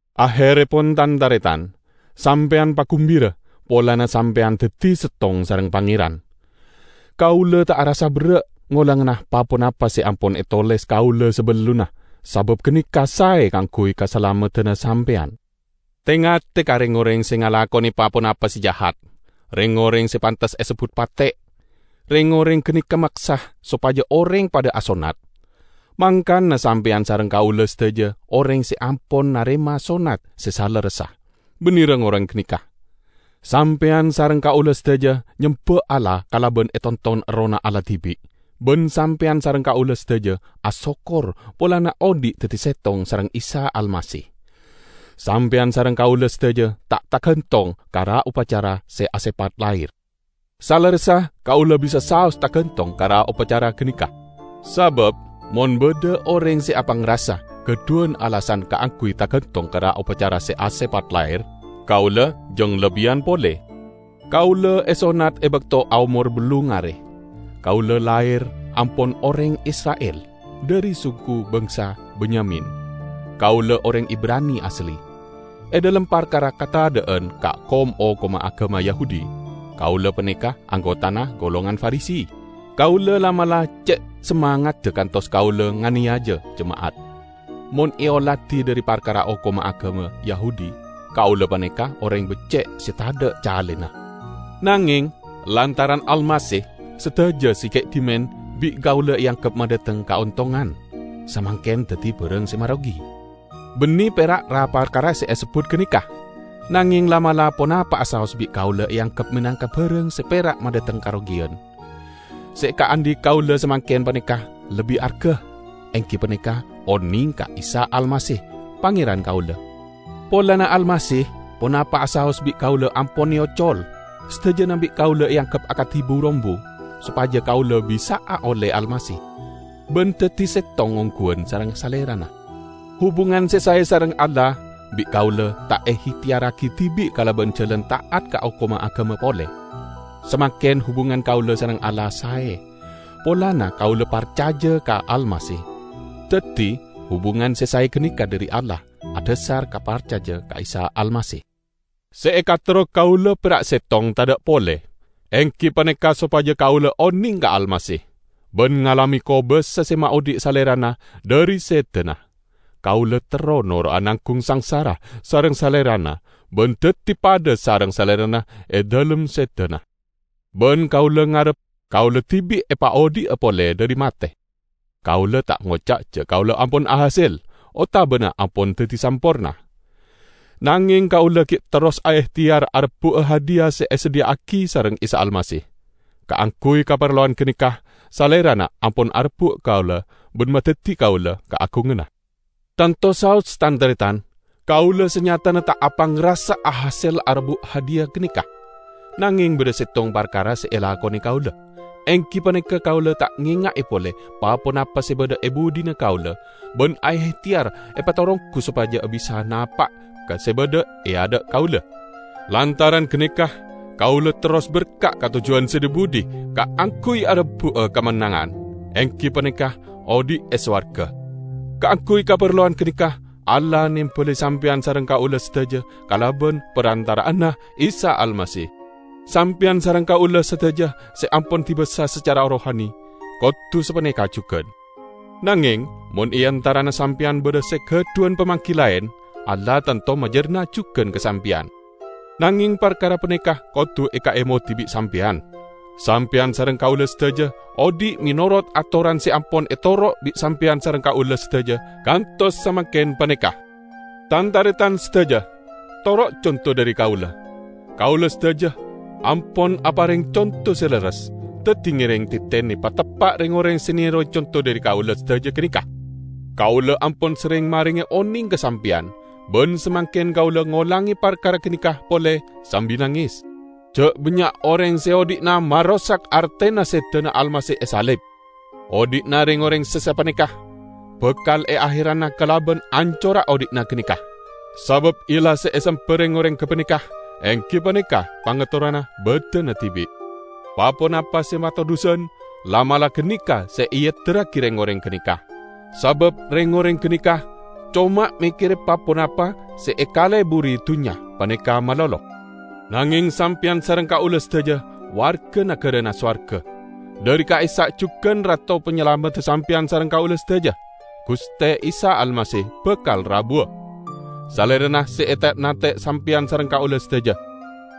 Aherrepon, tan-taretan, sampeyan pagumbira polana sampeyan daddi settong sareng Pangeran. Kaula ta' arassa berra' ngolangana pa-ponapa se ampon etoles kaula sabellunna; sabab ganeka sae kaangguy kasalameddanna sampeyan. Te-ngate ka reng-oreng se ngalakone pa-ponapa se jahat, reng-oreng se pantes esebbut 'pate''. Reng-oreng ganeka maksa sopaja oreng padha asonnat. Mangkana sampeyan sareng kaula sadaja oreng se ampon narema sonnat se salerressa, banne reng-oreng ganeka. Sampeyan sareng kaula sadaja nyemba Allah kalaban etonton Errohna Allah dibi', ban sampeyan sareng kaula sadaja asokkor polana odhi' daddi settong sareng Isa Almasih. Sampeyan sareng kaula sadaja ta' targantong ka ra-opacara se asepat lahir. Salerressa kaula bisa saos targantong ka ra-opacara ganeka. Sabab mon badha oreng se apangrasa gadhuwan alasan kaangguy targantong ka ra-opacara se asepat lahir, kaula jang lebbiyan pole. Kaula esonnat e bakto aomor ballung are. Kaula lahir ampon oreng Isra'il, dhari suku bangsa Benyamin: kaula oreng Ibrani asli. E dhalem parkara kata'adan ka kom-hokomma agama Yahudi, kaula paneka anggotana golongan Farisi. Kaula la'-mala' ce' samangadda kantos kaula nganeyaja jema'at. Mon eoladi dhari parkara hokomma agama Yahudi, kaula paneka oreng becce' se tadha' calena. Nangeng, lantaran Almasih, sadaja se gi' dhimen bi' kaula eanggep madhateng kaontongan, samangken daddi barang se marogi. Banne pera' ra-parkara se esebbut ganeka; nangeng la'-mala' ponapa'a saos bi' kaula eanggep menangka barang se pera' madhateng karogiyan. Se ekaandhi' kaula samangken paneka lebbi arga: enggi paneka oneng ka Isa Almasih, Pangeran kaula. Polana Almasih, ponapa'a saos bi' kaula ampon eocol. Sadajana bi' kaula eanggep akadi bu-rombu, sopaja kaula bisa'a olle Almasih, ban daddi settong ongguwan sareng Salerana. Hubungan se sae sareng Allah bi' kaula ta' eehteyarragi dibi' kalaban jalan ta'at ka hokomma agama pole. Samangken hubungan kaula sareng Allah sae, polana kaula parcaja ka Almasih. Daddi hubungan se sae ganeka dhari Allah, adhasar ka parcaja ka Isa Almasih. Se ekaterro kaula pera' settong tadha' pole, enggi paneka sopaja kaula oneng ka Almasih, ban ngalame kobasa se maodhi' Salerana dhari sedana. Kaula terro noro'a nanggung sangsara sareng Salerana ban daddi padha sareng Salerana e dhalem sedana. Ban kaula ngarep kaula dibi' epaodhi'a pole dhari mate. Kaula ta' ngoca' ja' kaula ampon ahasel, otabana ampon daddi samporna. Nangeng kaula gi' terros aehteyar arebbu'a hadiya se esadhiya'agi sareng Isa Almasih. Kaangguy kaparlowan ganeka Salerana ampon arebbu' kaula ban madaddi kaula kaagunganna. Tanto saos, tan-taretan, kaula sanyatana ta' apangrasa ahasel arebbu' hadiya ganeka. Nangeng badha settong parkara se elakone kaula, enggi paneka kaula ta' ngenga'e pole pa-ponapa se badha e budhina kaula ban aehteyar epataronggu sopaja bisa'a napa' ka se badha e adha' kaula. Lantaran ganeka kaula terros berka' ka tojjuwan se dhi-budhi kaangguy arebbu'a kamennangan, enggi paneka odhi' e sowarga; kaangguy kaparlowan ganeka Allah nembali sampeyan sareng kaula sadaja kalaban parantara'anna Isa Almasih. Sampeyan sareng kaula sadaja se ampon dibasa sacara rohani, kodu sapaneka jugan. Nangeng mon e antarana sampeyan badha se gadhuwan pamanggi laen, Allah tanto majarna' jugan ka sampeyan. Nangeng parkara paneka kodu ekaemodi bi' sampeyan: Sampeyan sareng kaula sadaja odhi' menorot atoran se ampon etoro' bi' sampeyan sareng kaula sadaja kantos samangken paneka. Tan-taretan sadaja, toro' conto dhari kaula. Kaula sadaja ampon apareng conto se lerres, daddi ngereng tetene pateppa' reng-oreng se nerowe conto dhari kaula sadaja ganeka. Kaula ampon serreng marenge oneng ka sampeyan, ban samangken kaula ngolange parkara ganeka pole sambi nanges, ja' bannya' oreng se odhi'na marosak artena sedana Almasih e salib. Odhi'na reng-oreng se sapaneka bakal eaherana kalaban ancorra odhi'na ganeka, sabab illah se esemba reng-oreng gapaneka enggi paneka pangaterrona badanna dibi'. Pa-ponapa se matodhusan, la'-mala' ganeka se eedirragi reng-oreng ganeka; sabab reng-oreng ganeka coma mekkere pa-ponapa se ekaleburi dunnya paneka malolo. Nangeng sampeyan sareng kaula sadaja warga nagarana sowarga. Dhari ka'issa' jugan Rato Panyalamedda sampeyan sareng kaula sadaja, Guste Isa Almasih, bakal rabuwa. Salerana se ete'-nante' sampeyan sareng kaula sadaja.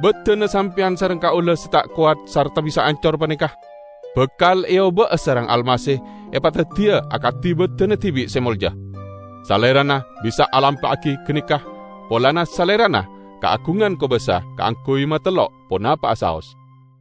Badanna sampeyan sareng kaula se ta' kowat sarta bisa ancor paneka, bakal eoba'a sareng Almasih epadaddiya akadi badanna dibi' se molja. Salerana bisa alampa'agi ganeka polana Salerana kaagungan kobasa kaangguy matellok ponapa'a saos.